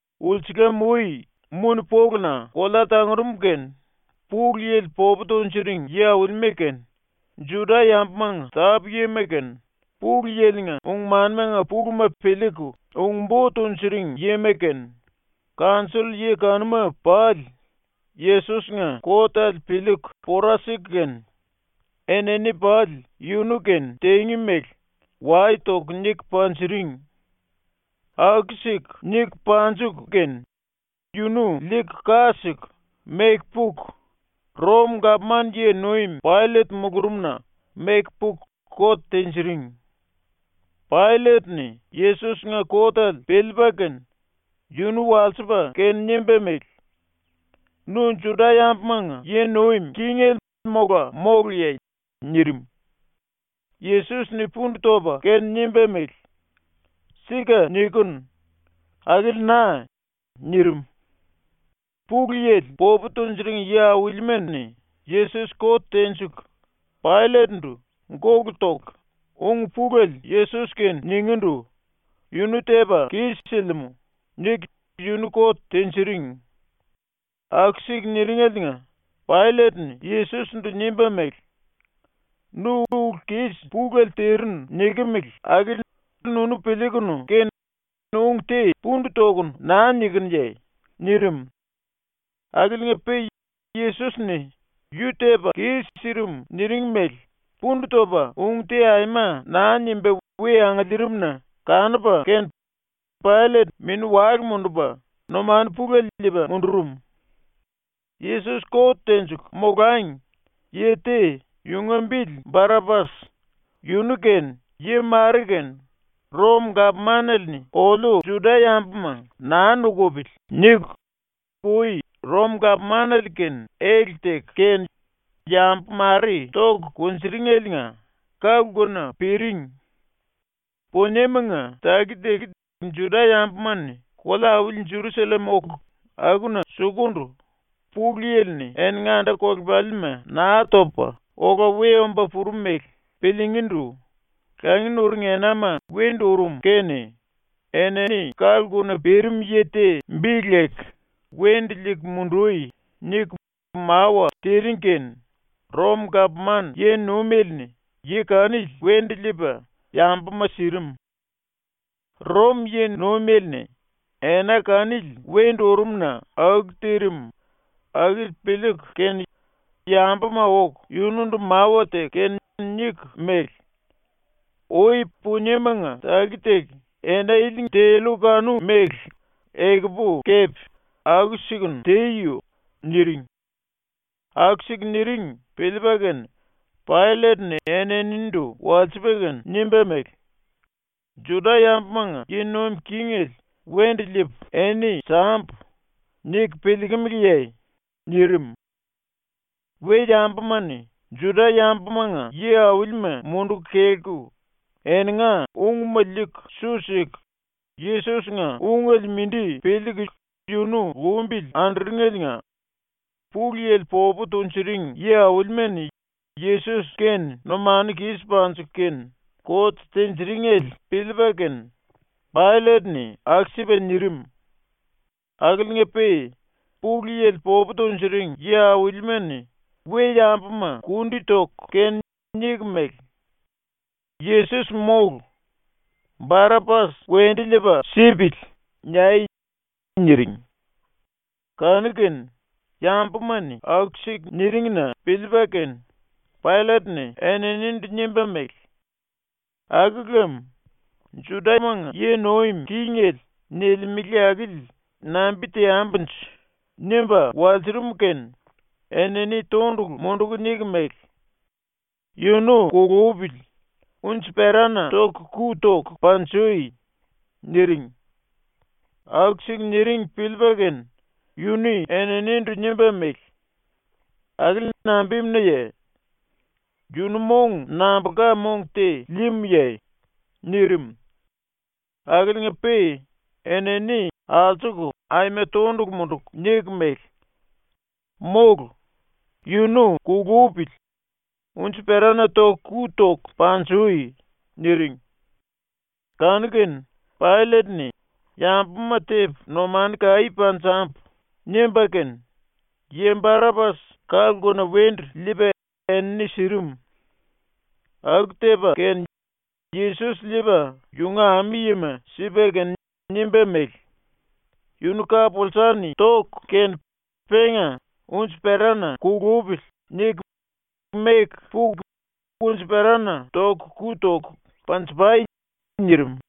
Ulsulam-ui muni-poluna kolea tangurum kene Pulu Yili popu tunjuring yi-aulima kene, Juda-yambumanga tápu-yima kene, Pulu Yili-nga ung-manimanga puluma piliiku ung-bo tunjuring yima kene, kanjoll-yi kanuma pali, ⸤Yesos-nga kotele piliiku pora siku kene⸥ enini pali ⸤yunu-kene tingí mele⸥ wai toku niku panjiring. Aku-siku niku panjiku kene yunu liiku, ka siku, meku puku, ⸤Rom-gapman yi-nuim⸥ Paillet mulurumna meku puku kot tinjiring. Paillet-ni ⸤Yesos-nga kotele piliipa kene⸥ yunu walsipa kene nimba mele: “Nu Juda-yambumanga yi nuim kingele mola móluye?” nirim. Yesos-ni pundu topa kene nimba mele: “Sika nikinu. Akili na.” nirim. Pulu Yili popu tunjuring yi-aulima-ni Yesos kot tenjiku Paillet-ndu ⸤gólu toku⸥ ung pulele Yesos-kene ningíndu “Yunu tepa kis-silimú.” niku yunu kot tinjiring. Aku-siku niringeliinga Paillet-ni Yesos-ndu nimba mele: “Nu ulu kis pulele tirinu nikimili akili nunu piliikunu kene ung te pundu tokunu naa nikinuye?” nirim. Akiliinga-pe Yesos-ni ⸤yu tepa kis-sirim niring mele⸥ pundu topa ung te aima naa nimba ⸤we angiliirim-na kanupa kene⸥ Paillet mini-wale mundupa numanu pulele liipa mundurum. ⸤Yesos kot tenjiku molangi,⸥ yi te, yunga bili Barapas, yunu kene yi mare kene ‘Rom-gapmanale-ni oliu Juda-yambuma naa nukupili.’ niku ui Rom-gapmanale-kene ele teku kene yambu mare toku kunjuringeliinga ka-lkuna piring. ⸤Puniemanga taki-taki Juda-yambuma-ni kolea-auli Jerusallem oku akuna sukundu⸥ Pulu Yili-ni eninga anda-kolepalima Naa Topa Ola We Omba Purum mele piliingíndu langi nuring enama wendu urum kene enini ka-lkuna pirim yi te bi leku ‘Wendu liiku mundui.’ niku mawa tiring kene ⸤Rom-gapman yi-nuimele-ni⸥ yi kanili wendu liipa yambuma sirim. ⸤Rom yi-nuimele-ni ena kanili wendu urum-na aku tirim akili piliiku kene⸥ yambuma oku yunundu mawa teku kene niku mele: “Ui puniemanga taki-taki ena ilinga tellu kanu-mele ekupu kepe aku-sikunu teyo.” niring. Aku-siku niring piliipa kene Paillet-ni eninindu walsipa kene nimba mele: “‘Juda-yambumanga yi nuim kingele wendu liipu eni sambu.’ niku piliikimiliye?” nirim. ⸤We-yambuma-ni Juda-yambumanga yi-aulima munduku kelku eninga ungma liiku su siku Yesos-nga ungele mindi piliiku yunu lumbili anduringeliinga⸥ Pulu Yili popu tunjuring yi-aulima-ni Yesos-kene numanu kis panjiku kene kot tinjiringele piliipa kene Paillet-ni aku-sipa nirim. Akiliinga-pe Pulu Yili popu tunjuring yi-aulima-ni we-yambuma kundi toku kene niku mele: “‘Yesos mólu. Barapas wendu liipa sipili.’ niai!” niring. Kanu-kene ⸤yambuma-ni⸥ aku-siku niring-na piliipa kene Paillet-ni eninindu nimba mele: “Aku lem ‘Judamanga yi nuim kingele’ nilimele akili nambi teambunje?” nimba walsurum kene enini tondulu munduku niku mele: “Yunu kulupili, unji-perana ⸤toku⸥ ku toku panjui!” niring. Aku-siku niring piliipa kene yu-ni eninindu nimba mele: “Akili nambimunaye? Yunu mong nambulka mong te líímuye?” nirim. Akiliinga-pe enini ⸤alsuku⸥ aima tondulu munduku niku mele: “Mólu! Yunu kulupili, unji-perana ⸤toku⸥ ku toku panjui!” niring. Kanu-kene Paillet-ni ‘Yambuma tepu numanu kaí panjambu.’ nimba kene yi Barapas ka-lkuna wendu liipa enini sirim. ⸤Aku tepa kene⸥ Yesos liipa ⸤yunga ami-yima⸥ sipa kene nimba mele: “Yunu ka-pulsa-ni toku kene penga ‘Unji-perana kulupili.’ niku meku puku unji-perana ⸤toku⸥ ku toku panji-pai.” nirim.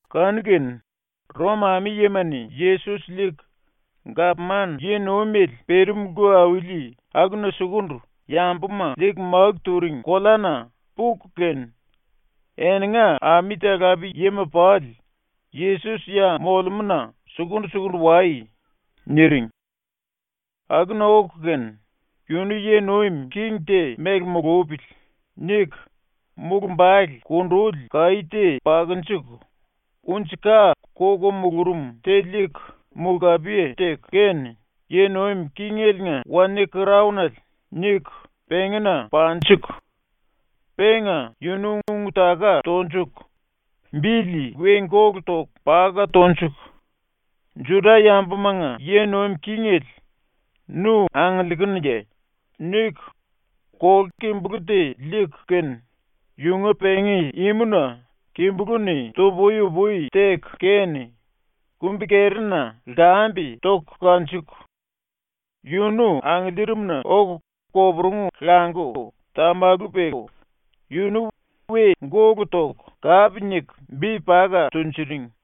Kanu-kene ⸤Rom⸥ ami-yima-ni Yesos liiku gapman yi-nuimele pirim lku auli akuna sukundu yambuma liiku máku turing koleana puku kene, eninga ami-talape-yima pali “⸤Yesos ya molemúna⸥ sukundu-sukundu wai.” niring. Akuna oku kene ‘Yunu yi nuim king te mele mulupili.’ niku mulumbale kunduli kaí te pakunjuku unji-ka koko mulurum te liiku mulkapiye teku kene ‘Yi nuim kingeliinga wanie-kraonele.’ niku pengína panjuku, penga yunu ⸤ung-taka tonjuku⸥ bili we gólu toku paka tonjiku “Juda-yambumanga yi nuim kingele, nu angiliikunuye?” niku ⸤kolu-kimbulú te liiku kene⸥ yunga pengí imuna kimbulú-ni tu-pui-upui teku kene kumbi-kerina lkambe toku kanjuku, yunu angiliirimna oku koporungu languku tamalu peku yunu we gólu toku kape niku bi paka tunjuring.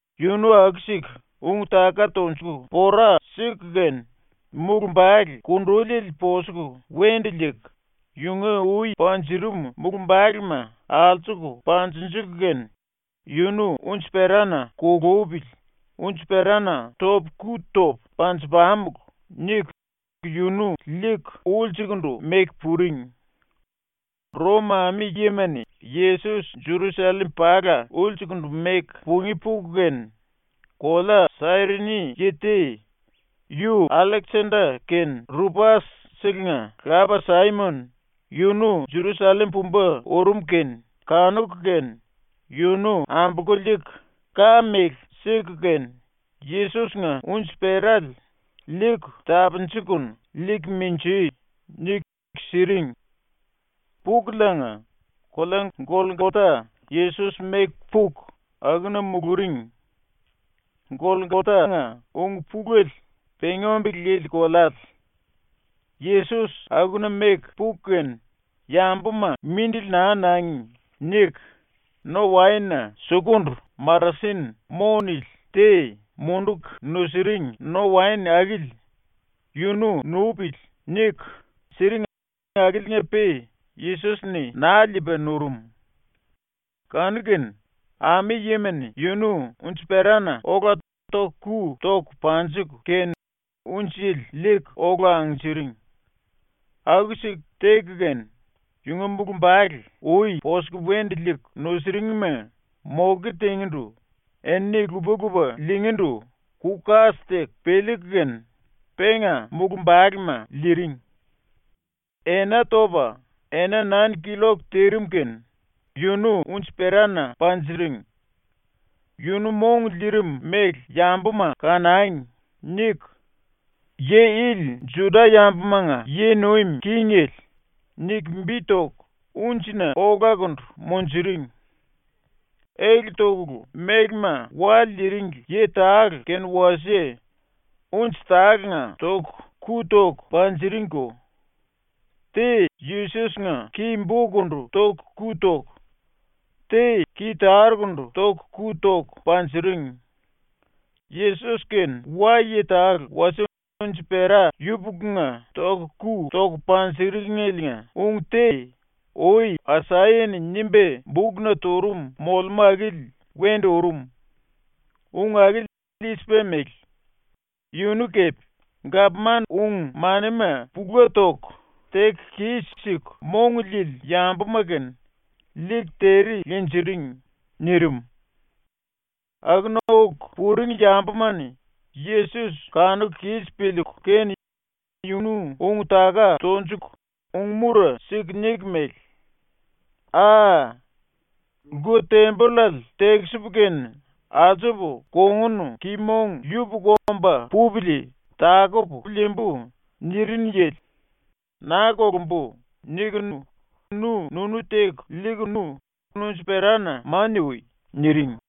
Yunu aku-siku ung-taka tonjuku pora siku kene mulumbale kunduliele posuku wendu liiku yunga ui panjurum mulumbalema alsuku panjinjiku kene “Yunu unji-perana kulupili unji-perana ⸤topu⸥ ku topu panju-pamulu.” niku yunu liiku ulsukundu meku puring. ⸤Rom ami-yima-ni Yesos Jerusallem pala ulsukundu meku pungí puku kene,⸥ kolea Sairini yi te, yu Alleksenda kene Rupas-selenga lapa Saimon, yunu Jerusallem pumba urum kene kanuku kene yunu ambolku liiku ka-mele siku kene Yesos-nga unji-perale “Liiku tapunjikunu liiku minjui!” niku siring. Pukuliinga kolea Golkota Yesos meku puku akuna muluring. (Golkotanga ung-pulele ‘pengí-ombele lili koleale’.) ⸤Yesos akuna meku puku kene, ‘Yambuma mindili naa nangi.’ niku⸥ no-waen-na sukundu marasin ‘mo’ nili te munduku nusiring no-waen akili ‘Yunu nupili.’ niku, siring akiliinga-pe Yesos-ni naa liipa nurum. Kanu-kene ⸤ami-yima-ni⸥ yunu unji-perana ola ⸤toku⸥ ku toku panjiku kene unjele liiku ola angnjiring. Aku-siku teku kene, yunga mulumbale ⸤ui posuku wendu liiku nusuringma⸥ moke tingíndu enini lupa-lupa liingíndu ku-kas teku piliiku kene penga mulumbalema liiring. Ena topa ena nain killok tirim kene yunu unji-perana panjiring. ‘Yunu mong liirim mele yambuma kanangi.’ niku YI ILI JUDA-YAMBUMANGA YI NUIM KINGELE niku bi toku unjina olakundu munjuring. Ele tokulu mélema wa liiringli yi tale kene wasie unji tálenga ⸤toku⸥ ku toku panjiringko. Te Yesos-nga ki-bokundu ⸤toku⸥ ku toku, te ki-tarukundu ⸤toku⸥ ku toku panjiring. (⸤Yesos kene wa-yi tale wasie unji-pera yupukunga ⸤toku⸥ ku toku panjiringeliinga⸥ ung te ui Asaya-ni nimba bukna turum molemú akili wendu urum. Ung akili i-sipa mele: “Yunu kepe gapman ung-manima pula toku teku kis-siku mong liili yambuma kene liiku tere linjiring.” nirim.) Akuna oku puring yambuma-ni Yesos ⸤kanuku kis piliiku kene yunu⸥ ung-taka tonjuku ung-mura siku niku mele: “Aa! “Lku-tembollale tekisipu kene alsupu kongun ki-mong yupuku omba pupili takupu liimbu.” nirinu yili, ‘Naa kolumbu.’ nikunu nu-nunu teku liikunu unji-perana mania ui.” niring.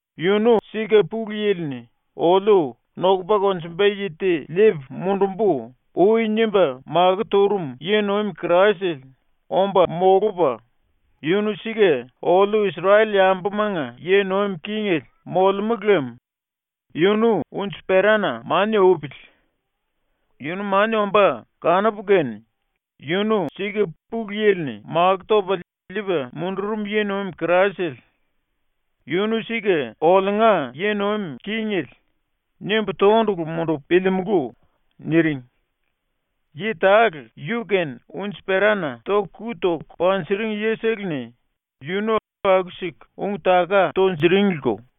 Yunu sika Pulu Yili-ni oliu ‘Nokupa konjumba yi te liipu mundumbu.’ ui nimba makó turum yi-nuim Kraisele omba molupa, yunu sika oliu Isrel-yambumanga yi nuim kingele molemú lem yunu unji-perana mania upili. Yunu mania ombá kanupu kene ‘Yunu sika Pulu Yili-ni makó topa liipa mundurum yi-nuim Kraisele. Yunu sika oliunga yi nuim kingele.’ nimbu tondulu mundupu piliimulú.” niring. Yi tale yu-kene unji-perana ⸤toku⸥ ku toku panjiring yisele-ni yunu aku-siku ung-taka tunjuringliko.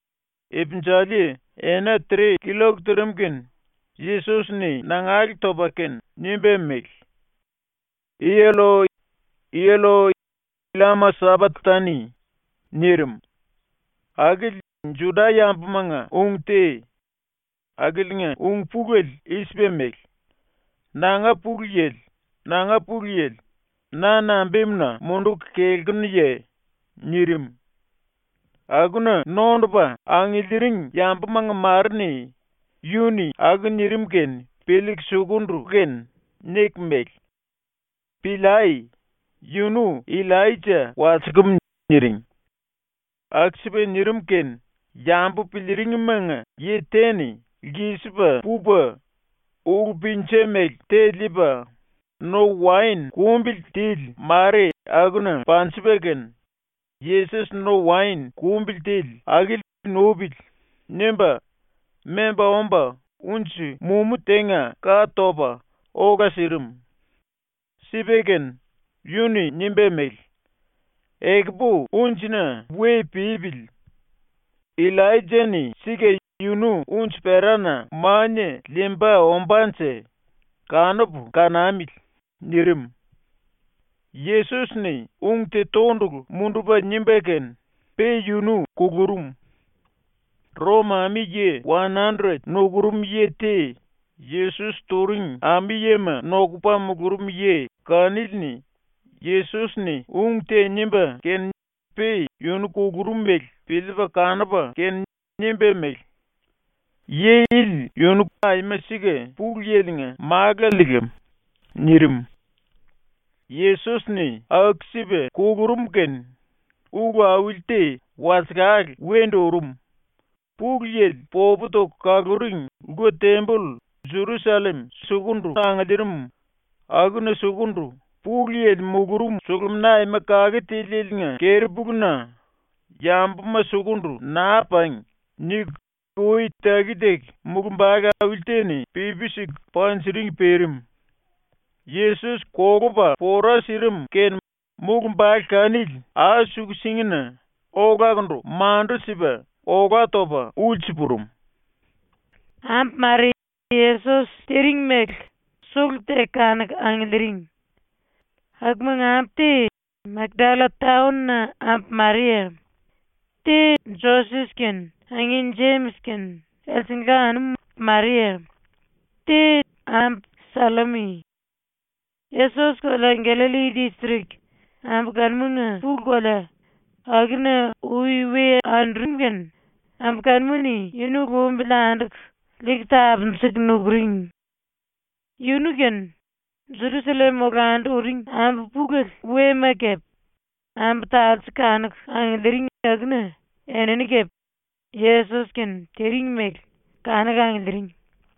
Ipinjali ena tre killok tirim kene Yesos-ni nangale topa kene nimba mele: “Elloi, Elloi, llama sapaktani.” nirim. Akili Juda-yambumanga ung te. Akiliinga ung-pulele i-sipa mele: “Nanga Pulu Yili, nanga Pulu Yili, na nambimuna munduku kelkunuye?” nirim. Akuna nondupa angiliiring yambumanga mare-ni yu-ni aku nirim kene piliiku ⸤sunduku kene⸥ niku mele: “Piliai! Yunu Illaija walsikim.” niring. Aku-sipa nirim kene yambu piliiringmanga yi te-ni lkisipa pupa ulú-pinja mele te liipa no-waen kumbili tili mare akuna panjipa kene, ‘Yesos no-waen kumbili tili akili nupili.’ nimba memba omba unji-mumú tenga ka topa ola sirim. Sipa kene yu-ni nimba mele: “Ekupu unjina we pipili. Illaija-ni sika yunu ⸤unji-perana⸥ mania liimba ombánje, kanupu kanamili.” nirim. Yesos-ni ung te tondulu mundupa nimba kene pe yunu kulurum. ⸤Rom⸥ ami-yi wan-andret nukurum yi te Yesos turing ami-yima nokupa mulurum yi kanili-ni Yesos-ni ung te nimba kene pe yunu kulurum mele piliipa kanupa kene nimba mele: “Yi ili yunu aima sika Pulu Yili-nga málale lam.” nirim. ⸤Yesos-ni aku-sipa kulurum kene ulu auli te walsekale wendu urum.⸥ Pulu Yili popu toku kaluring lku-temboll ⸤Jerusallem sukundu angiliirim akuna sukundu Pulu Yili mulurum⸥ Sulumina Aima Kake Tilieliinga keri-puluna ⸤‘Yambuma sukundu naa pangi.’ niku ui taki-taki⸥ mulumbale auli te-ni pipi siku panjiring pirim. ⸤Yesos kolupa pora sirim kene⸥ mulumbale kanili ai-suku-singina olakundu mandu-sipa olá topa ulsu purum. Ambu mare ⸤Yesos tiring mele⸥ sulu-teku kanuku angiliiring. Akumanga ambu te Makdalla taon-na ambu Maria, te Joses kene angin Jemis kene elsengla anum Maria, te ambu Sallomi. Yesos kolea Gallalli distrik, ⸤ambu kanumanga pulu kolea,⸥ akuna ui we andurum kene ambu kanuma-ni yunu lumbili anduku liiku tapunjuku nukuring. Yunu kene, Jerusallem olandu uring ambu pulele wema kepe, ambu talse kanuku angiliiring akuna enini kepe ⸤Yesos-kene tiring mele⸥ kanuku angiliiring.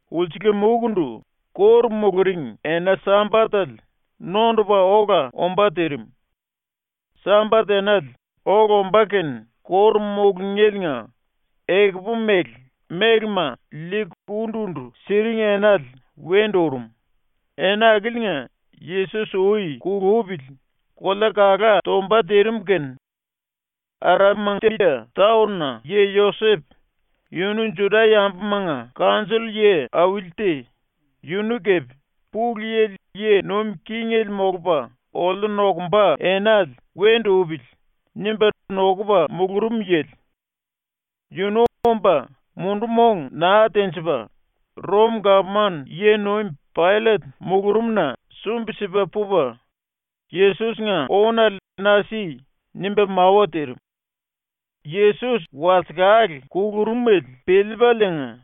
Ulsulam-uikundu ⸤kóru muluring⸥ ena-Sambatele nondupa ola ombá tirim. Sambat enale ola ombá kene kóru mulungéliinga ekupu-mele mélema liiku undu-undu siring enale wendu urum, ena akiliinga ⸤Yesos ui kulupili⸥ kolea kalá tomba tirim kene, Arimatia taon-na yi Josep, yunu Juda-yambumanga kanjoll-yi auli te, yunu kepe ‘Pulu Yili yi nuim kingele molupa oliu nokumba enale wendu upili.’ nimba nokupa mulurum yili. Yunu omba mundu-mong naa tenjipa ⸤Rom-gapman yi-nuim⸥ Paillet mulurumna sumbi-sipa pupa “Yesos-nga ónale na si.” nimba mawa tirim. Yesos walsekale kulurumele piliipaliinga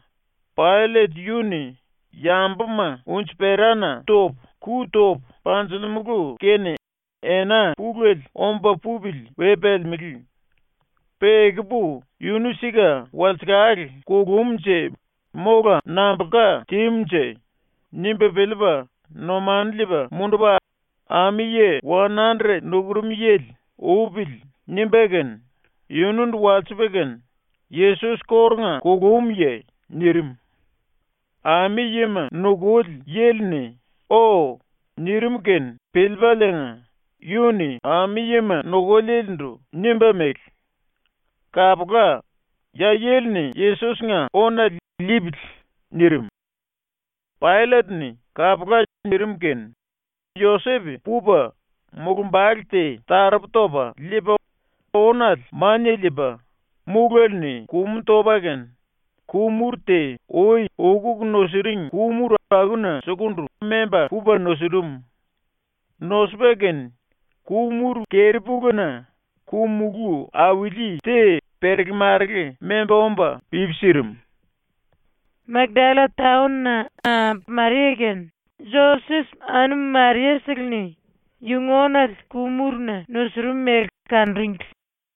Paillet yu-ni ⸤‘Yambuma unji-perana ⸤toku⸥ ku topu panjilimulu kene ena pulele omba pupili we pelemelé. Pe ekupu yunu sika walsekale kulumnje mola nambulka tímunje?’ nimba piliipa⸥ numanu liipa mundupa ami-yi wan-andret nukurum yili “Upili.” nimba kene yunundu walsipa kene “Yesos kórunga kulumuye?” nirim. Ami-yima nukuli yili-ni “O.” nirim kene piliipaliinga yu-ni ami-yima nukulielendu nimba mele: “Kapula, ya yili-ni ⸤Yesos-nga⸥ ónale liipili.” nirim. ⸤Paillet-ni “Kapula.” nirim kene⸥ Josep pupa mulumbale te taropu topa liipa ónale mania liipa, múlele-ni kumu topa kene ku-muru te ui ukuku nusiring ku-muru akuna sukundu memba pupa nusurum. Nosupa kene ku-muru keri-puluna ku-mulú auli te perele-marele memba omba pipi sirim. Makdalla taon-na ambu Maria kene Joses anum Maria-seleni yunga ónale ⸤ku-muruna⸥ nusurum mele kanuringli.